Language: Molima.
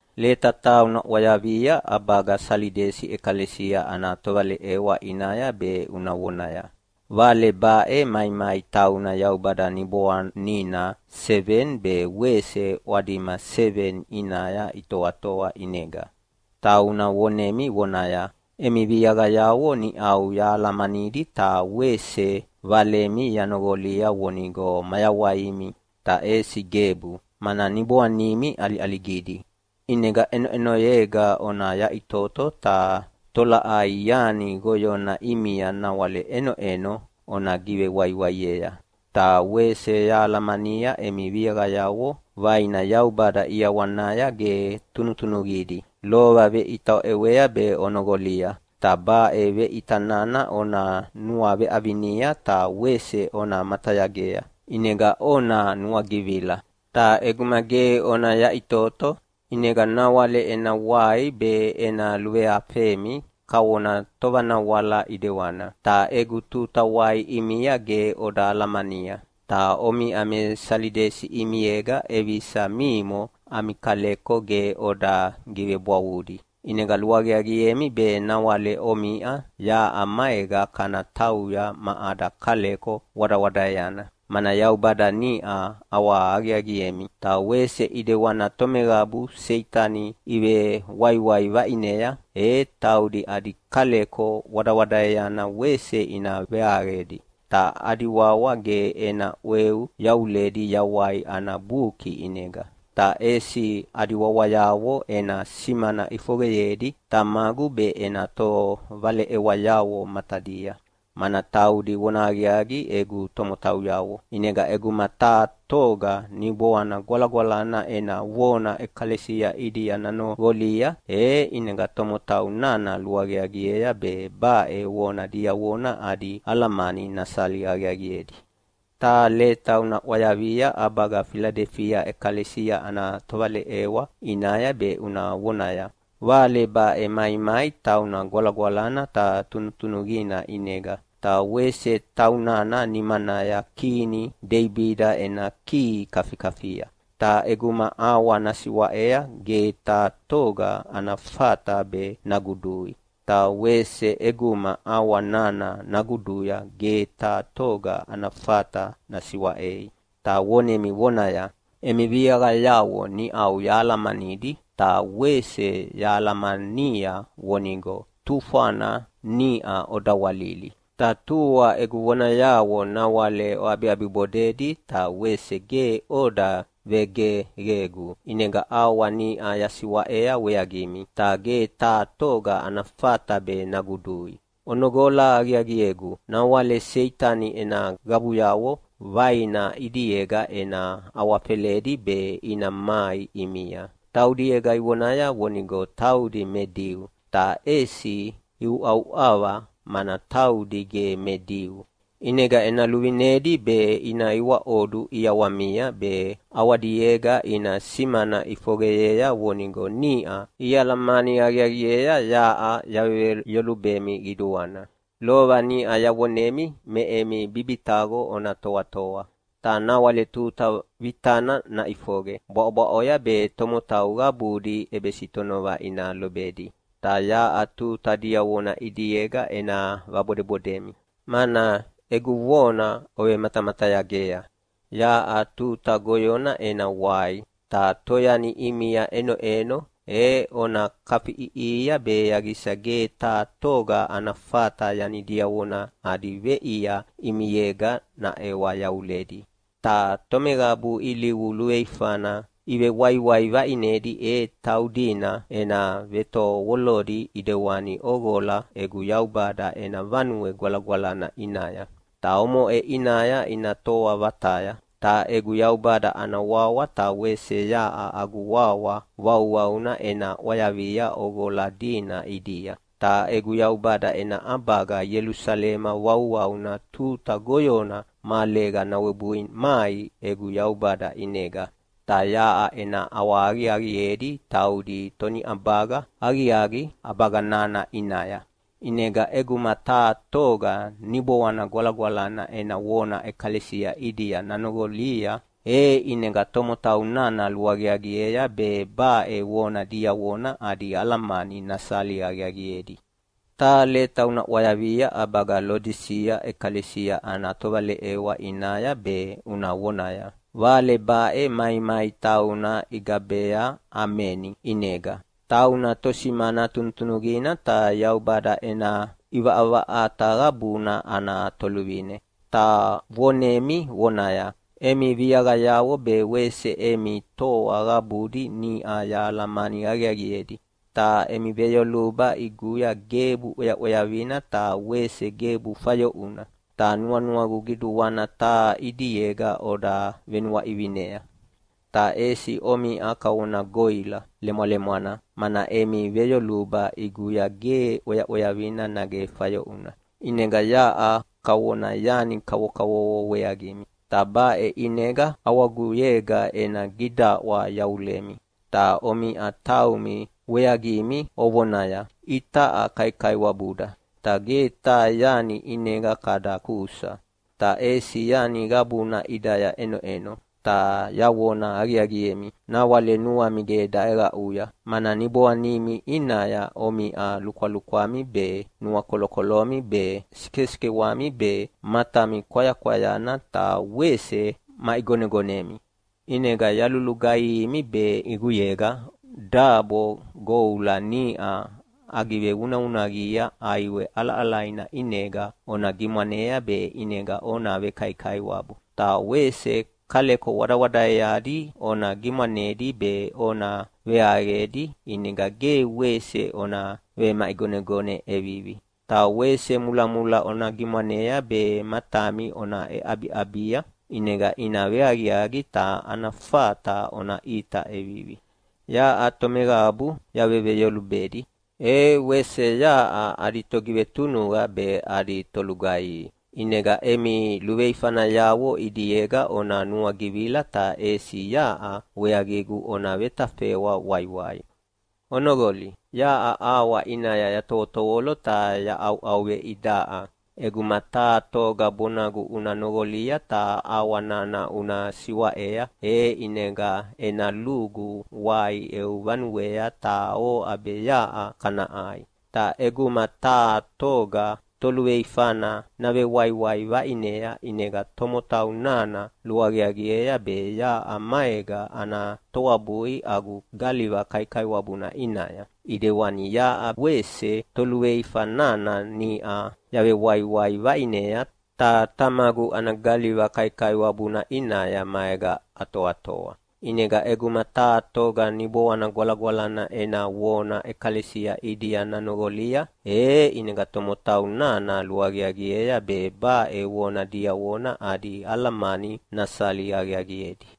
“Leta taha una ʼwayavia ʼabaga Salidesi ʼekalesia ana tovaleʼewa ʼinaya be una vonaya, Vale baʼe maimai tauna Yaubada Niboanina seveni be wese ʼwadima seveni ʼinaya itoatoa ʼinega. Tauna vonemi vonaya, Emi viaqayavo niʼau yahalamanidi ta wese valemi yanoqolia vonigo mayawaimi. Ta ʼesi gebu, mana niboanimi ʼaliʼaligidi. ʼInega ʼenoʼenoyega ona yaʼitoto, ta tolaʼai yani goyona ʼimia nawale ʼenoʼeno ona givewaiwaiea. Ta wese yahalamania emi viaqayavo vaina Yaubada ʼiawanaya ge tunutunuqidi. Lova veʼita oʼewea be onoqolia, ta baʼe veʼita nana ona nuaveʼavinia ta wese ona matayagea, ʼinega ona nuagivila. Ta ʼeguma ge ona yaʼitoto, ʼinega nawale ena wai be ena luveafemi kavona tovanawala ʼedewana, ta egu tuta wai ʼimia ge oda alamania. Ta omiʼa me Salidesi ʼimiega ʼevisa mimo ami kaleko ge oda givebwavudi. ʼInega luaqiaqiemi be nawale omiʼa yaʼa maega kana tauya ma ada kaleko wadawadaeana, mana Yaubada niʼa ʼawahaqiaqiemi. Ta wese ʼidewana tomeqabu Seitani ivewaiwai vaʼinea, e taudi adi kaleko wadawadaeana wese ina veaqedi, ta adi wawa ge ena ʼweu yavuledi Yawai ana Buki ʼinega, ta ʼesi adi wawayavo ena simana ʼifoqeyedi Tamagu be ena tovaleʼewayavo matadia, mana taudi vonahaqiaqi egu tomotauyavo. ʼInega ʼeguma taha toga Niboana Gwalagwalana ena vona ʼekalesia ʼidia nanoqolia, e ʼinega tomotau nana luaqiaqiea be baʼe vona diavona adi alamani nasali aqiaqiedi. “Taha leta una ʼwayavia ʼabaga Filadelifia ʼekalesia ana tovaleʼewa ʼinaya be una vonaya, Vale baʼe maimai tauna gwalagwalana ta tunutunuqina ʼinega, ta wese taunana nimanaya kini Deibida ena kihi kafikafia. Ta ʼeguma ʼawa nasiwaʼea ge taha toga ana fata be nagudui, ta wese ʼeguma ʼawa nana naguduya ge taha toga ana fata nasiwaʼei. Ta vonemi vonaya, Emi viaqayavo niʼau yahalamanidi ta wese yahalamania vonigo tufwana niʼa odawalili. Ta tua egu vonayavo nawale oʼabiʼabibodedi ta wese ge oda vegeqegu. ʼInega ʼawa niʼa yasiwaʼea weaqimi, ta ge taha toga ana fata be nagudui. Onoqola aqiaqiegu! Nawale Seitani ena qabuyavo vaina ʼidiega ena awafeledi be ina mai ʼimia. Taudiega ivonaya vonigo taudi me Diu, ta ʼesi iuʼauʼava mana taudi ge me Diu. ʼInega ena luvinedi be ina iwaʼodu ʼiawamia be ʼawadiega ina simana ʼifoqeyea vonigo niʼa ialamani aqiaqiea yaʼa yaveveyolubemi qiduana. Lova niʼa yavonemi me emi bibitaqo ona toatoa. Ta nawale tuta vitana naʼifoqe bwaʼobwaʼoya be tomotau qabudi ʼebesitonova ina lobedi. Ta yaʼa tuta diavona ʼidiega ena vabodebodemi, mana egu vona ovematamatayagea. Yaʼa tuta goyona ena wai, ta toyani ʼimia ʼenoʼeno e ona kafiʼiʼihia be yaqisa ge taha toga ana fata yani diavona adi veʼia ʼimiega naʼewa yavulei. Ta tomeqabu ilivu luveifana ivewaiwai vaʼinedi e taudina ena vetovolodi ʼidewani ʼoqola egu Yaubada ena Vanue Gwalagwalana ʼinaya, ta omoʼe ʼinaya ina toa vataya. Ta egu Yaubada ana wawa ta wese yaʼa agu wawa vauvauna ena ʼwayavia ʼoqola dina ʼidia. Ta egu Yaubada ena ʼabaga Ielusalema vauvauna tuta goyona mahalega nawebui mai egu Yaubada ʼinega. Ta yaʼa ena ʼawahaqiaqiedi taudi toniʼabaga aqiaqi ʼabaga nana ʼinaya. ʼInega ʼeguma taha toga Niboana Gwalagwalana ena vona ʼekalesia ʼidia nanoqolia, e ʼinega tomotau nana luaqiaqiea be baʼe vona diavona adi alamani nasali aqiaqiedi. “Taha leta una ʼwayavia ʼabaga Lodisia ʼekalesia ana tovaleʼewa ʼinaya be una vonaya, Vale baʼe maimai tauna igabea ‘Ameni’ ʼinega. Tauna tosimana tunutunuqina ta Yaubada ena ʼivaʼavaʼata qabuna ana toluvine. Ta vonemi vonaya, Emi viaqayavo be wese emi toa qabudi niʼa yahalamani aqiaqiedi. Ta emi veyoluba ʼiguya gebu ʼweaʼweavina ta wese gebu fayoʼuna. Ta nuanuagu qiduana taha ʼidiega oda venuaʼivinea. Ta ʼesi omiʼa kavona goʼila lemwalemwana, mana emi veyoluba ʼiguya ge ʼweaʼweavina nage fayoʼuna. ʼInega yaʼa kavona yani kavokavovo weaqimi, ta baʼe ʼinega ʼawaguyega ena gidaʼwa yavulemi. Ta omiʼa taumi weaqimi ovonaya, “Itaʼa kaikaiwabuda, ta ge taha yani ʼinega kada kusa, ta ʼesi yani qabuna ʼidaya ʼenoʼeno!” Ta yavona aqiaqiemi, nawale nuami ge daʼeqaʼuya, mana niboanimi ʼinaya omiʼa lukwalukwami be, nuakolokolomi be, sikesikewami be, matami kwayakwayana ta wese maʼigonegonemi. ʼInega yalulugaihimi be ʼiguyega dabo goula niʼa agivevunavunaqia ʼaiwe ʼalaʼalaina ʼinega ona gimwanea be ʼinega ona vekaikaiwabu, ta wese kaleko wadawadaeadi ona gimwanedi be ona veaqedi ʼinega ge wese ona vemaʼigonegone ʼevivi. Ta wese mulamula ona gimwanea be matami ona ʼeʼabiʼabia, ʼinega ina veaqiaqi ta ana fata ona ʼita ʼevivi. Yaʼa tomeqabu yaveveyolubedi, e wese yaʼa adi togivetunuqa be adi tolugaihi. ʼInega emi luveifanayavo ʼidiega ona nuagivila ta ʼesi yaʼa weaqigu ona vetafeʼwa waiwai. Onoqoli! Yaʼa ʼawa ʼinaya yatovotovolo ta yaʼauʼauveidaʼa. ʼEguma taha toga bonagu una noqolia ta ʼawa nana una siwaʼea, e ʼinega ena lugu wai eu vanuea ta oʼa be yaʼa kana ʼai. Ta ʼeguma taha toga toluveifana navewaiwai vaʼinea ʼinega tomotau nana luaqiaqiea be yaʼa maega ana toabui agu galiva kaikaiwabuna ʼinaya, ʼidewani yaʼa wese toluveifa nana niʼa yavewaiwai vaʼinea ta Tamagu ana galiva kaikaiwabuna ʼinaya maega atoatoa. ʼInega ʼeguma taha toga Niboana Gwalagwalana ena vona ʼekalesia ʼidia nanoqolia, e ʼinega tomotau nana luaqiaqiea be baʼe vona diavona adi alamani nasali aqiaqiedi.”